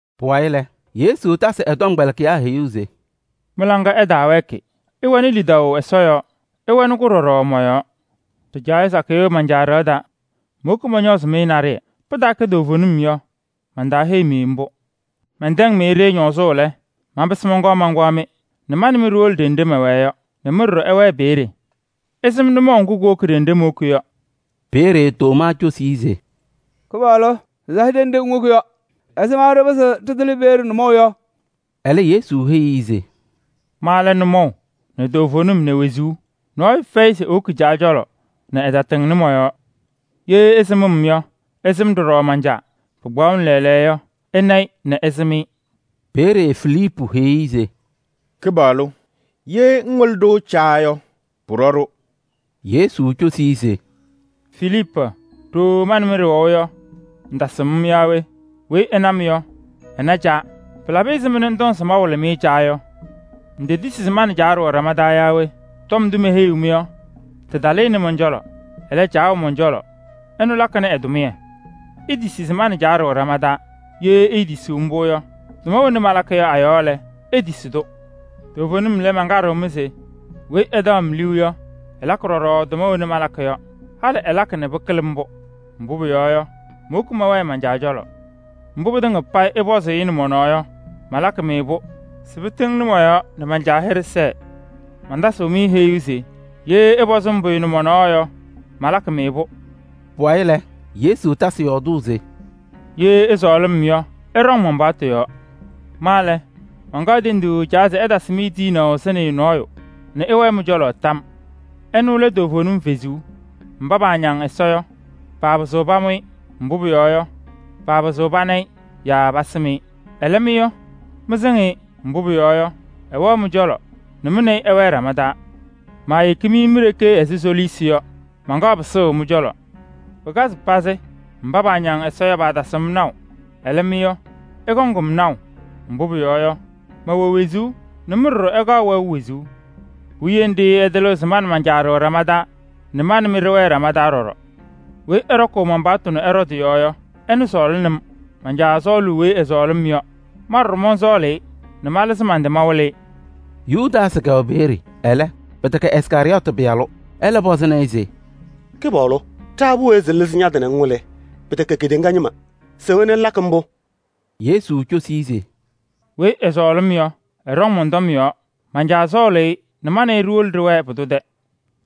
Pʋwayɩ lɛ, Yesu tasɩ ɛ-tɔmkpɛlɩkɩyaa heyuu se: “Mɩ-laŋa ɛtaawɛɛkɩ, ɩwɛnɩ lidaʋ Ɛsɔ yɔɔ, ɩwɛnɩ-kʋ ɖɔɖɔ mɔ-yɔɔ. Ɖɩjaɣyɛ sakɩyɛ wɛ man-Caa ɖɩɣa taa. Mowoki mɔñɔɔzɩ-mɩ naɖɩyɛ. Pɩtaakɛ toovenim yɔ, mantaaheyi-mɩ mbʋ. Mɛntɛŋ-mɩ-ɖɩ ñɔɔzʋʋ lɛ, manpɩsɩ mɔnkɔɔ mankpaɣ-mɩ nɛ ma nɛ mɩ ɖiwolo ɖenɖe mɛwɛɛ yɔ nɛ mɩ ɖɔɖɔ ɩwɛɛ peeye. Ɩsɩm nʋmɔʋ ŋgʋ kuwoki ɖenɖe mowoki yɔ.” Peeye Tomaa cosi-i se: “Kɩpaɣlʋ! Ɖɩtasɩ ɖenɖe ŋwoki yɔ. Ɛzɩma ɖɩpɩzɩɣ ɖɩtɩlɩ peeye nʋmɔʋ yɔ?” Ɛlɛ Yesu heyi-i se: “Ma lɛ nʋmɔʋ nɛ toovenim nɛ wezuu. Nɔɔyʋ fɛyɩ se ewoki Caa cɔlɔ nɛ ɛtatɩŋnɩ mɔ-yɔɔ. Ye ɩsɩm-m yɔ, ɩsɩŋ ɖɔɖɔ man-Caa. Pɩkpaɣʋnɩ lɛɛlɛɛyɔ yɔ, ɩna-ɩ nɛ ɩsɩm-ɩ.” Peeye Filiipu heyi-i se: “Kɩpaɣlʋ! Ye ŋwɩlɩ-ɖʋ Caa yɔ, pʋɖɔ-ɖʋ.” Yesu cosi-i se: “Filiipu! Ɖooo ma nɛ mɩ ɖɩwɛʋ yɔ, ŋtasɩm-m yaa we? Weyi ɛna-m yɔ, ɛna Caa. Pɩlabɩ ɛzɩma nɛ ŋtɔŋ se mawɩlɩ-mɩ Caa yɔ? Ŋtetisi se ma nɛ Caa ɖɩwɛ ɖama taa yaa we? Tɔm ndʋ meheyiɣ-mɩ yɔ, tɩtalɩnɩ mɔn-cɔlɔ. Ɛlɛ, Caa wɛ mɔn-cɔlɔ, ɛnʋ lakɩnɩ ɛ-tʋmɩyɛ. Itisi se ma nɛ Caa ɖɩwɛ ɖama taa. Ye iitisiɣ mbʋ yɔ, tʋma wena malakɩ yɔ a-yɔɔ lɛ, itisi-tʋ. Toovenim lɛ, mankaɖɩɣ-mɩ se: weyi ɛtaɣ-m liu yɔ, ɛlakɩ ɖɔɖɔ tʋma wena malakɩ yɔ. Halɩ ɛlakɩ nɛ pɩkɩlɩ mbʋ, mbʋ pʋyɔɔ yɔ, mowoki mɛwɛɛ man-Caa cɔlɔ. Mbʋ pɩtɩŋa payɩ ɩpɔzʋʋ-ɩ nɛ mɔ-nɔɔ yɔ, malakɩ-pʋ se pɩtɩŋnɩ mɔ-yɔɔ nɛ man-Caa hɩɖɛ sɛɛ. Mantasɩɣ-mɩ heyuu se: ye ɩpɔzɩ-m pʋyʋ nɛ mɔ-nɔɔ yɔ, malakɩ-mɩ-pʋ.” Pʋwayɩ lɛ, Yesu tasɩ yɔɔdʋʋ se: “Ye ɩsɔɔlɩ-m yɔ, ɩɖɔŋ man-paɣtʋ yɔɔ. Ma lɛ, mankaɣ tenduu Caa se ɛtasɩ-mɩ tiyinaʋ Sɩnɩyʋ nɔɔyʋ nɛ ɛwɛɛ mɩ-cɔlɔ tam yɔɔ: ɛnʋ lɛ toovenim Kalɩzaɣ. Mba paañaŋ Ɛsɔ yɔ, paapɩzɩɣ pamʋ-ɩ, mbʋ pʋyɔɔ yɔ, paapɩzɩɣ pana-ɩ yaa pasɩm-ɩ. Ɛlɛ mɩ yɔ, mɩsɩŋ-ɩ, mbʋ pʋyɔɔ yɔ, ɛwɛɣ mɩ-cɔlɔ nɛ mɩ nɛ ɩ ɩwɛɛ ɖama taa. Maayeki-mɩ mi-ɖeke ɛzɩ soliisi yɔ, mankaɣ pɩsʋʋ mɩ-cɔlɔ. Pɩkazɩ pazɩ, mba paañaŋ Ɛsɔ yɔ, paatasɩɣ-m naʋ. Ɛlɛ mɩ yɔ, ɩkɔŋ-m naʋ, mbʋ pʋyɔɔ yɔ, mɛwɛ wezuu nɛ mɩ ɖɔɖɔ ɩkaɣ wɛʋ wezuu. Puwiye nɖɩ ɩtɩlɩɣ se ma nɛ man-Caa ɖɩwɛ ɖama taa nɛ ma nɛ mɩ ɖɩwɛɛ ɖama taa ɖɔɖɔ. Weyi ɛɖɔkʋʋ man-paɣtʋ nɛ ɛɖɔ tɩ-yɔɔ yɔ, ɛnʋ sɔɔlɩnɩ-m. Man-Caa sɔɔlʋʋ weyi ɛsɔɔlɩ-m yɔ. Ma ɖɔɖɔ mɔnsɔɔlʋʋ-ɩ nɛ malɩzɩ man-tɩ mawɩlɩ-ɩ.” Yudaasɩ kɛwɛ peeye, ɛlɛ, pɩtɛkɛ Iskarɩyɔɔtɩ pɩyalʋ. Ɛlɛ pɔzɩnɩ-ɩ se: “Kɩpaɣlʋ! Ɛzɩma ŋlɩzɩɣ ña-tɩ nɛ ŋwɩlɩ-ɖʋ nɛ kedeŋa ñɩma ɛɛnaɣ-ŋ?” Yesu cosi-i se: “Weyi ɛsɔɔlɩ-m yɔ, ɛɖɔŋ mɔn-tɔm yɔɔ. Man-Caa sɔɔlʋʋ-ɩ nɛ ma nɛ ɩ ɖiwolo ɖɩwɛɛ pʋdʋ tɛ.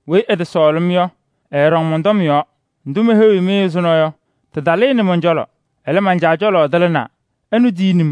Weyi ɛtɔsɔɔlɩ-m yɔ, ɛɛɖɔŋ mɔn-tɔm yɔɔ. Ndʋ meheyiɣ-mɩ ɛzʋnɔ yɔ, tɩtalɩnɩ mɔn-cɔlɔ, ɛlɛ, man-Caa cɔlɔ tɩlɩnaa. Ɛnʋ tiyini-m.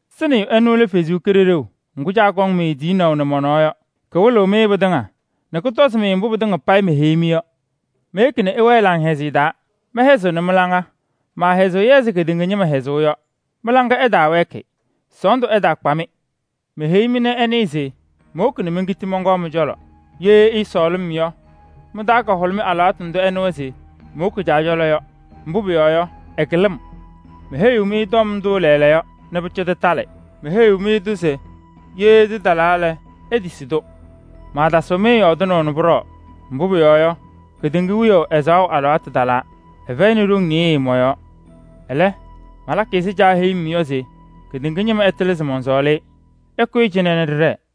Sɩnɩyʋ ɛnʋ lɛ Ɛsɔ Kalɩzaɣ. Ŋga Caa kɔŋ-mɩ tiyinaʋ nɛ mɔ-nɔɔ. Kɔkɔŋ-mɩ wɩlʋʋ pɩtɩŋa nɛ kɔtɔzɩ-mɩ mbʋ pɩtɩŋa payɩ meheyi-mɩ yɔ. Meyeki nɛ ɩwɛɛ laŋhɛzɩyɛ taa, mɛhɛzɩɣnɩ mɩ-laŋa. Maahɛzɩɣ-yɛ ɛzɩ kedeŋa ñɩma hɛzʋʋ yɔ. Mɩ-laŋa ɛtaawɛɛkɩ, sɔɔndʋ ɛtaakpa-mɩ. Meheyi-mɩ nɛ ɩnɩɩ se mowoki nɛ menkiti mɔnkɔɔ mɩ-cɔlɔ. Ye ɩɩsɔɔlɩ-m yɔ, mɩ-taa kahʋlʋmɩ alɩwaatʋ ndʋ ɩnɩwa se mowoki Caa cɔlɔ yɔ. Mbʋ pʋyɔɔ yɔ, ɛkɩlɩ-m. Meheyi-mɩ tɔm ndʋ lɛɛlɛɛyɔ se pʋcɔ tɩtalɩ. Meheyi-mɩ mbʋ se ye tɩtalaa lɛ, itisi-tʋ. Maatasɩɣ-mɩ yɔɔdɩnaʋ nɛ pʋɖɔɔ, mbʋ pʋyɔɔ yɔ, kedeŋa wiyaʋ alɩwaatʋ talaa. Ɛfɛyɩnɩ ɖoŋ nɩɩyɩ mɔ-yɔɔ. Ɛlɛ, malakɩ ɛzɩ Caa heyuu-m yɔ se kedeŋa ñɩma ɛtɩlɩ se mɔnsɔɔlɩ-ɩ. Ɩkʋyɩ cɩnɛ nɛ ɖɩɖɛɛ!”